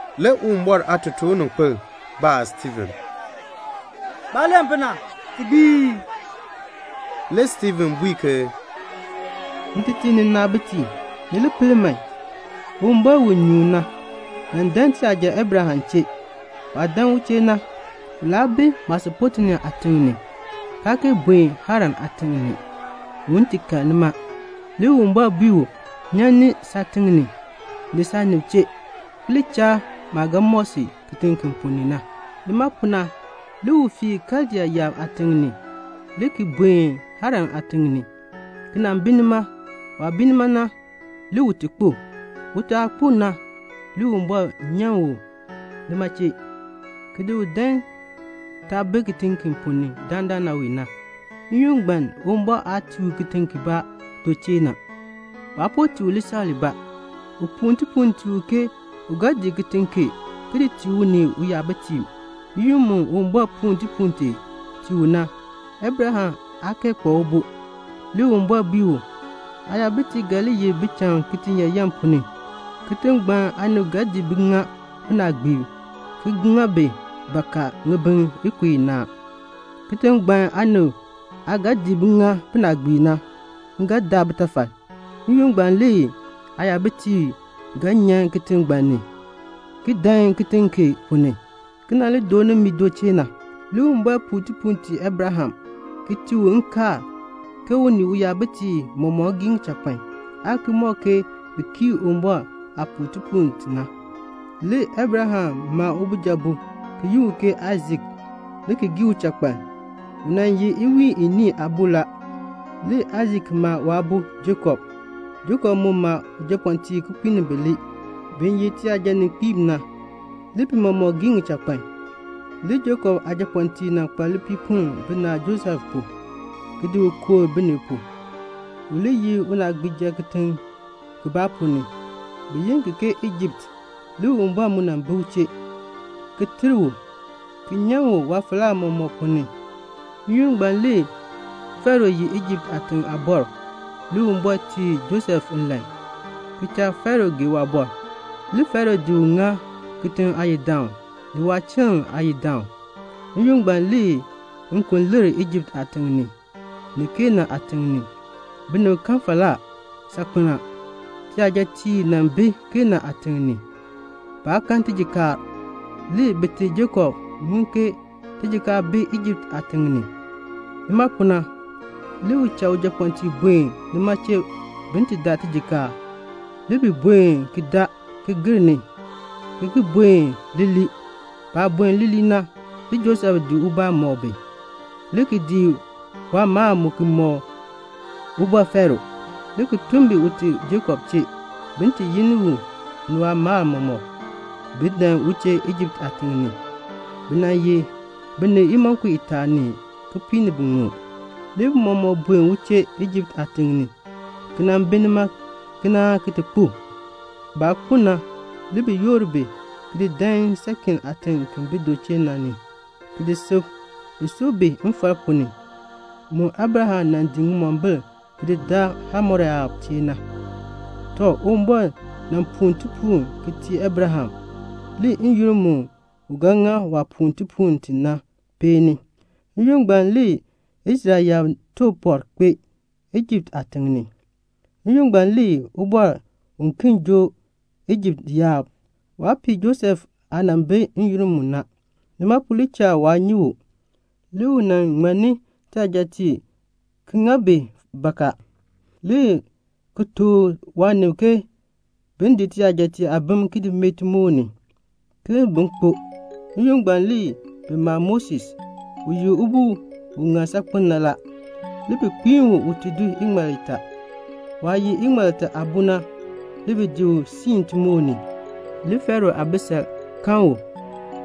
Le Uwumbɔr aatotoorninkpil baa Stiifen, "Baah len pu na, ti gbii ii?" Le Stiifen bui ke, "Ntetiib ni nnaabitiib, ni li pel man. Uwumbɔr, u nyuun na, nan dan tiyaja Abraham chee. Waah dan u chee na, u laa bi Mesopotamia aatiŋ ni, kaa kee buen Haran aatiŋ ni, un ti kal nima. Le Uwumbɔr bui u, 'Nyan ni saatiŋ ni, ni saanib chee, ki li cha maah ga mɔk si kitiŋ ki ponn ni na.' Nima pu na, le u fii Kaldea yaab aatiŋ ni, le ki buen Haran aatiŋ ni, ki nan bi nima. Waah bi nima na, le ute kpo. Ute aah kpo na, le Uwumbɔr nyan u nima chee, ki di u dan taah bi kitiŋ ki ponn ni dandana wee na. N-yoonn ngbaan Uwumbɔr aa tii u kitiŋ kibaa du chee na. Waa po tii u lisaŋ libaa. U puu tipuul tii u ke u ga di kitiŋ kee ki di tii u ni uyabitiib. N-yoonn mu Uwumbɔr puu tipuul tee tii u na, Abraham aa kee kpa ubo. Le Uwumbɔr bui u, 'Aayabitiib ga li ye bicham kitiyaayan ponn ni. Kitiŋ ngbaan aanib ga di bi ŋa binaagbiib, ki ŋa bi bakaa ŋibin ikub inaa. Kitiŋ ngbaan aanib aah ga di bi ŋa binaagbiib na, m ga daa bitafal. N-yoonn ngbaan le aayabitiib ga nyan kitiŋ ngbaan ni, ki dan kitiŋ kee ponn ni, ki nan li dooni mi du chee na.' Le Uwumbɔr puu tipuul tii Abraham, ki tii u nkaal, ke u ni uyabitiib mɔmɔk gii ŋichakpan, aan ki mɔk ke bi kii Uwumbɔr aah puu tipuul ti na. Le Abraham ma ubijabo ki yi u ke Aisak le ki gii uchakpaln, u nan ye iwiin iniin aabo la. Le Aisak ma waabo Jakob. Jakob mu ma japɔɔtiib kipiik ni bilee bi ye tiyajaninkpiib na. Le bi mɔmɔk gii ŋichakpan. "Le Jakob aajapɔɔtiib nan kpa lipiipoln binaal Josef pu, ki di u kooh binib pu, u li ye unaagbiija kitiŋ kibaa ponn ni, bi yi ki ke Ijipt. Le Uwumbɔr mu nan bi u chee, ki ter u, ki nyan u waafalaa mɔmɔk ponn ni. N-yoonn ngbaan le Faro ye Ijipt aatiŋ aabɔr. Le Uwumbɔr tii Josef nlan, ki cha Faro gee waabɔr. Le Faro di u ŋa kitiŋ ngbaan aayidaan, ni waachiln aayidaan. N-yoonn ngbaan le nkon lir Ijipt aatiŋ ni, ni Kanaan aatiŋ ni. Binib kan falaa saakpen a. Tiyajatiib nan bi Kanaan aatiŋ ni. Baa kan tijikaar. Le bite Jakob ŋun ke tijikaar bi Ijipt aatiŋ ni. Nima pu na, le u cha ujapɔɔtiib buen nima chee bin ti daa tijikaar. Le bi buen ki daa, ki gir ni, ki ki buen leelee. Baah buen leelee na, le Josef di ubaa mɔk bi, le ki di waamaal mu ki di mɔk Ubɔr Faro, le ki tun bi ute Jakob chee, ke bin ti yi ni u ni waamaal mɔmɔk, bin dan u chee Ijipt aatiŋ ni. Bi nan ye binib imonko itaa ni kipiik ni biŋmu. Le bi mɔmɔk buen u chee Ijipt aatiŋ ni, ki nan bi nima kenaa ki ti kpo. Baah kpo na, le bi yoor bi le ki di dan Shekem aatiŋ ki bi du chee na ni, ki ti di sub. Bi sub bi mfal ponn ni, mu Abraham nan di ŋimombil ki daa Hamor yaab chee na. "Tɔ, Uwumbɔr nan puu tipuul ki tii Abraham. Le n-yoonn mu u ga ŋa waah puu tipuul ti na peeni. N-yoonn ngbaan le Israel yaab took pɔr kpee, Ijipt aatiŋ ni. N-yoonn ngbaan le ubɔr uken joo Ijipt yaab. Waa pii Josef aah nan bi n-yoonn mu na. Nima pu le cha waa nyi u. Le u nan ŋmanni tiyajatiib ki ŋa bi bakaa, le ki tuk waanib ke bin di tiyajatiib aabim ki mee timoor ni, ke bin kpo. N-yoonn ngbaan le bi ma Moses, u ye ubo u ŋan saakpen na la. Le bi kpiin u ute do iŋmal itaa. Waah ye iŋmal itaa aabo na, le bi di u siin timoor ni. Le Faro aabisal kan u,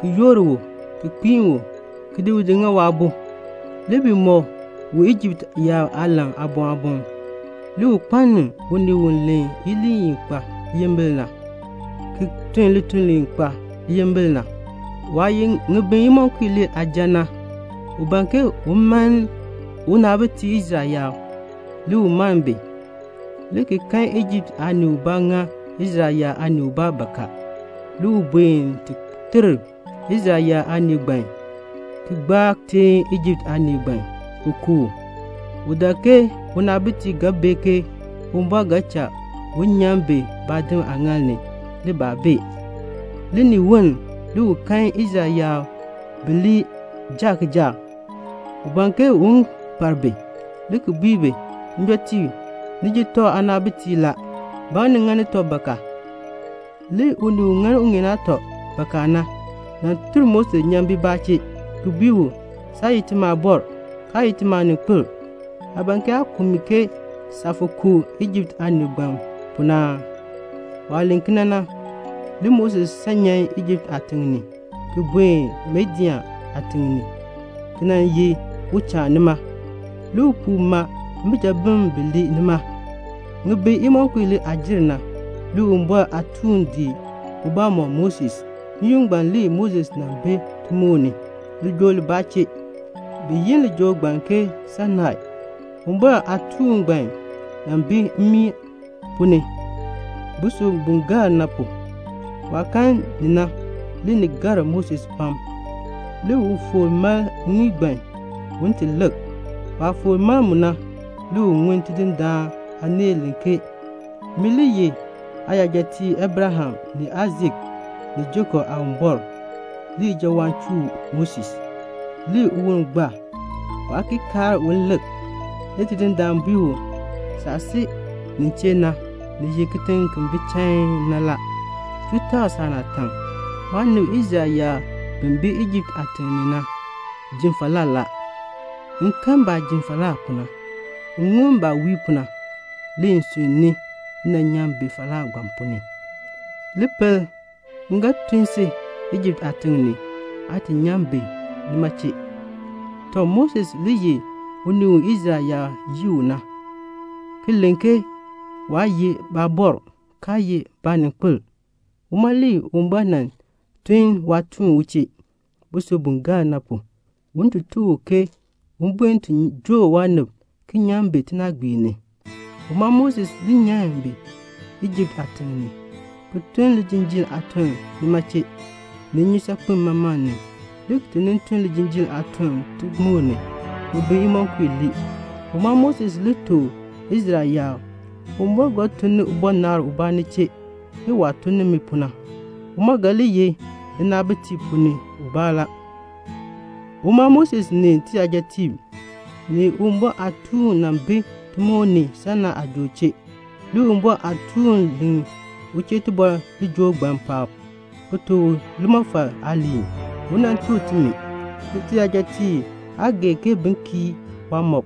ki yoor u, ki kpiin u, ki di u ŋa waabo. Le bi mɔk u Ijipt yaab aalan aaboŋ aaboŋ. Le u kpaln unii u len iliin i kpa liyimbil na, ki tun lituln li kpa liyimbil na. "Waah ye ŋibin imonko ilee aaja na, u ban ke un mann unaabitiib Israel yaab. Le u mann bi, le ki kan Ijipt aanii ubaa ŋa Israel yaab aanii ubaa bakaa. Le u buen ti ter Israel yaab aanii ngbaan, ki gbaa teen Ijipt aanii ngbaan, ki ku u. (U dak ke unaabitiib ga bee ke Uwumbɔr ga cha u nyan bi baadim aaŋaal ni. Le baa bee.) Le ni woln le u kan Israel yaab bilee jaa kijaak. U ban ke un par bi, le ki bui bi, 'Njɔtiib, ni ye tɔb naabitiib la. Ba ŋa ni ŋani tɔb bakaa?' Le unii u ŋa uŋeen aatɔ bakaa na, nan tur Moses nyan bibaa chee, ki bui u, 'Saa ye timi aabɔr, kaa ye timi aaninkpil. Aa ban ke aa ku mi ke saah fo ku Ijipt aanii ngbaan pu na aa?' Waah len kena na, le Moses san nyan Ijipt aatiŋ ni, ki buen Midian aatiŋ ni, ki nan ye uchaan nima. Le upuu ma mbijabim bilee nima. "Ŋibin imonko ilee aah jer na, le Uwumbɔr aatuun di ubaa mɔk Moses. N-yoonn ngbaan le Moses nan bi timoor ni, lijool libaa chee. Bi yi lijool ngbaan ke Sainai. Uwumbɔr aatuun ngbaan nan bi mmii ponn ni, busub bu gaal na pu. Waah kan ni na, le ni gar Moses pam. Le u foor mal mmii ngbaan un ti lik. Waah foor mal mu na, le u ŋun Tidindaan aaneel len ke, 'Min le ye aayajatiib Abraham, ni Aisak, ni Jakob Aawumbɔr.' Le ijawaan chuu Moses, le uwon gbaa. Waa ki kaar un ki lik. Le Tidindaan bui u, 'Saah si nin chee na, ni ye kitiŋ ki bi chain na la. Chuu takl saanaatak. Maanib Israel yaab bi bi Ijipt aatiŋ ni na ji falaa la. M kan baah ji falaa pu na, ki ŋun baah wii pu na. Le m sunn ni m nan nyan bi falaa ngbaan ponn ni. Li pel, m ga tun si Ijipt aatiŋ ni, aa ti nyan bi nima chee.' "Tɔ, Moses le ye unii u Israel yaab yii u na, ki len ke waa ye baabɔr, kaa ye baaninkpil. Uma le Uwumbɔr nan tun waatuun u chee, busub bu gaal na pu, un ti tuk u ke un buen ti joo waanib ki nyan bi tinaagbiir ni. Uma Moses le nyan bi Ijipt aatiŋ ni, ki tun lijinjiir aatun nima chee, ni Nnyusaakpem Maman ni, le ki ti nin tun lijinjiir aatun timoor ni, ŋibin imonko ilee. Uma Moses le tuk Israel yaab, 'Uwumbɔr ga tun ni ubɔnabr ubaa ni chee, ke waah tun ni mi pu na. U mu ga li ye ninaabitiib ponn ni ubaa la.' Uma Moses ni tiyajatiib, ni Uwumbɔr aatuun nan bi timoor ni, Sainai aajool chee, le Uwumbɔr aatuun len u chee tibɔr lijool ngbaan paab, ki tuk u limɔfal aaliin, u nan tuk timi. "Le tiyajatiib aa gee ke bin kii waamɔb.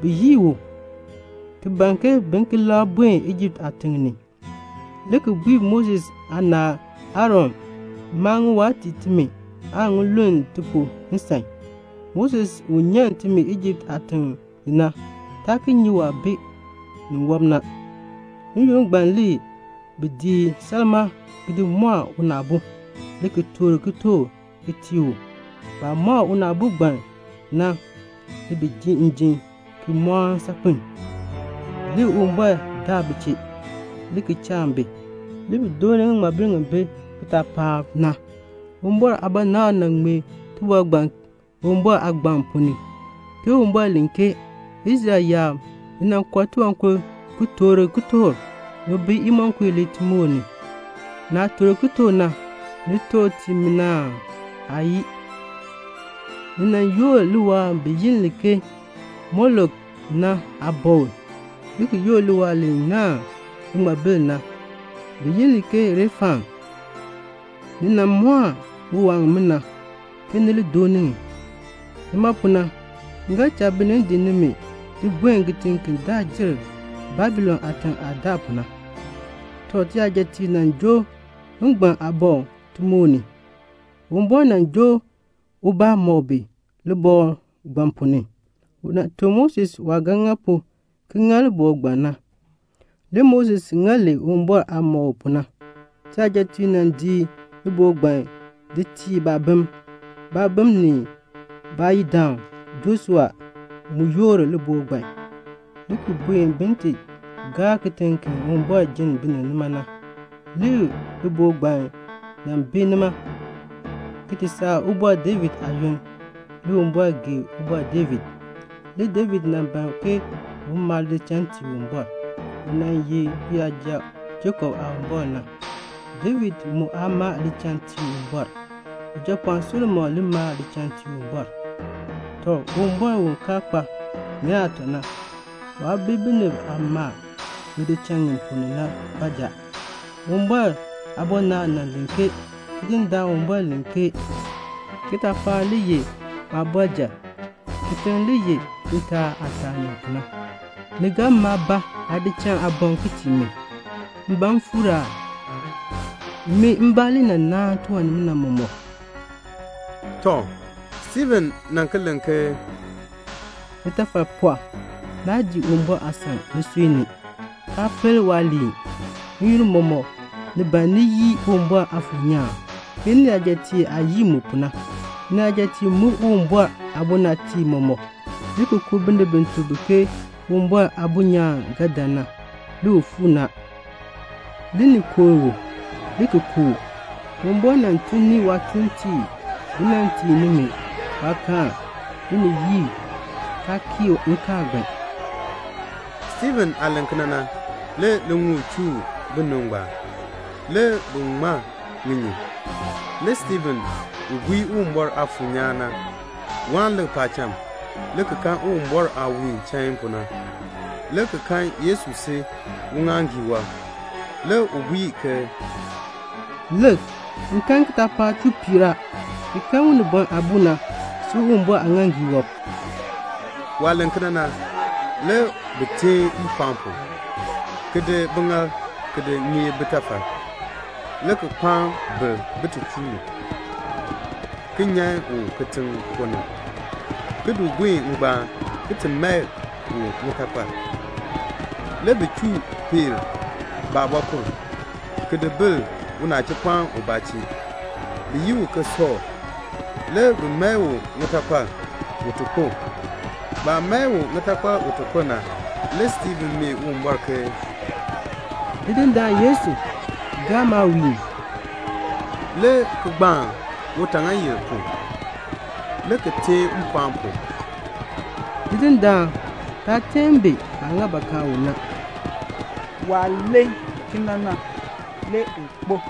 Bi yii u, ki ban ke bi ki labr buen Ijipt aatiŋ ni, le ki bui Moses aanaal Aaron, 'Maa ŋiwaa tii timi, aan ŋi luln ti pu nsan. Moses u nyan timi Ijipt aatiŋ ni na, taa ki nyi waah bi niwɔb na.' N-yoonn ngbaan le bi di salmaa ki mɔɔ unaabo, le ki toor kitork ki tii u. Baah mɔɔ unaabo ngbaan na, le bi ji njim ki mɔɔni saakpen. Le Uwumbɔr daak bi chee, le ki cha bi, le bi dooni ŋiŋmabil ŋi bi kitaapaak ni na. Uwumbɔr aabɔnabr nan ŋmee tibɔr ngbaan Uwumbɔr aagbaŋ ponn ni, ke Uwumbɔr len ke 'Israel yaab, ni nan kɔr tiwankur ki toor kitork ŋibin imonko ilee timoor ni. Naah toor kitork na, ni toor di tii min aa? Aayii. Ni nan yoor liwaal bi yi li ke Molok na aabɔkl, le ki yoor liwaal li naahn liŋmabil na, bi yi li ke Refan. Ni nan mɔɔ ŋiwaa ŋimina, ke ni li dooni ŋi. Nima pu na, m ga cha binib di nimi di buen kitiŋ ki daa jer Babilon aatiŋ aah daa pu na.' "Tɔ, tiyajatiib nan joo ngban aabɔkl timoor ni. Uwumbɔr nan joo ubaa mɔk bi libɔkl ngbaan ponn ni. U nan tuk Moses waah ga ŋa pu ki ŋa libɔkl ngbaan. Le Moses ŋa li Uwumbɔr aah mɔk u pu na. Tiyajatiib nan di libɔkl ngbaan di tii baabim. Baabim ni baayidaan Joshua mu yoor libɔkl ngbaan, le ki buen bin ti gaa kitiŋ ki Uwumbɔr jenn binib nima na. Le libɔkl ngbaan nan bi nima, ki ti saa Ubɔr David aayoonn. Le Uwumbɔr gee Ubɔr David. Le David nan ban ke un maa lidichal tii Uwumbɔr, u nan ye uyaja Jakob Aawumbɔr na. David mu aa maa lidichal tii Uwumbɔr. Ujapɔɔn Solomon le maa lidichal tii Uwumbɔr. "Tɔ, Uwumbɔr u kaa kpa ŋeen aatɔ na, waa bi binib aah maa ŋidichal ŋi na ponn ni baanja. Uwumbɔr aabɔnabr nan len ke Tidindaan Uwumbɔr len ke 'Kitaapaak le ye maabɔrjal, kitiŋ le ye ntaa aah taani pu na: ni ga maa ba aadichal aaboŋ ki tii mi? M ban m fuur aa? Min mbaa le nan naan tiwan nimina mɔmɔk."' Tɔ, Stiifen nan ki len ke "Nitafal pɔɔ, naa dii Uwumbɔr aasan nisui ni, kaa pel waaliin. N-yoonn mɔmɔk ni ban ni yii Uwumbɔr Aafuur nyaan, ke niyajatiib aah yii mu pu na. Niyajatiib muk Uwumbɔr aabɔnabtiib mɔmɔk, le ki ku binib bi tuk bi ke Uwumbɔr Aabo nyaan ga dan na. Le u fuu ni a, le ni kooh u, le ki ku u. Uwumbɔr nan tun ni waatuuntiib bi nan tii nimi waakaal. Le ni yii, kaa kii nkaal ngbaan." Stiifen aah len kena na, le liŋuul chuu binib ngbaan. Le bi ŋma ŋinyin. Le Stiifen u gbii Uwumbɔr Aafuur nyaan na, waan lik paacham, le ki kan Uwumbɔr aah wiin chain pu na, le ki kan Yesu si uŋaaŋgii wɔb. Le u bui ke, "Lik, m kan kitaapaak chuu piir a, ki kan Unibɔn Aabo na si Uwumbɔr aaŋaaŋgii wɔb." Waah len kena na, le bi teen mpɔɔn pu, ki di biŋaal ki di ŋeeb bitafal, le ki kpaan ber bin ti chuu u, ki nyan u kitiŋ ponn ni, ki di buen ngbaan, ki ti mae u ŋitakpal. Le bi chuu peer baabɔkur, ki di bil unachipɔɔn ubaa chee, bi yi u ke Sɔɔl. Le bi mae u ŋitakpal un ti kpo. Baah mae u ŋitakpal na, le Stiifen mee Yesu ke, "Tidindaan Yesu, gaa maawiin," le ki gbaan utaaŋaayil pu, le ki teen mpɔɔn pu, "Tidindaan, taa teen bi baah ŋa bakaa u na." Waah len kena na, le u kpo.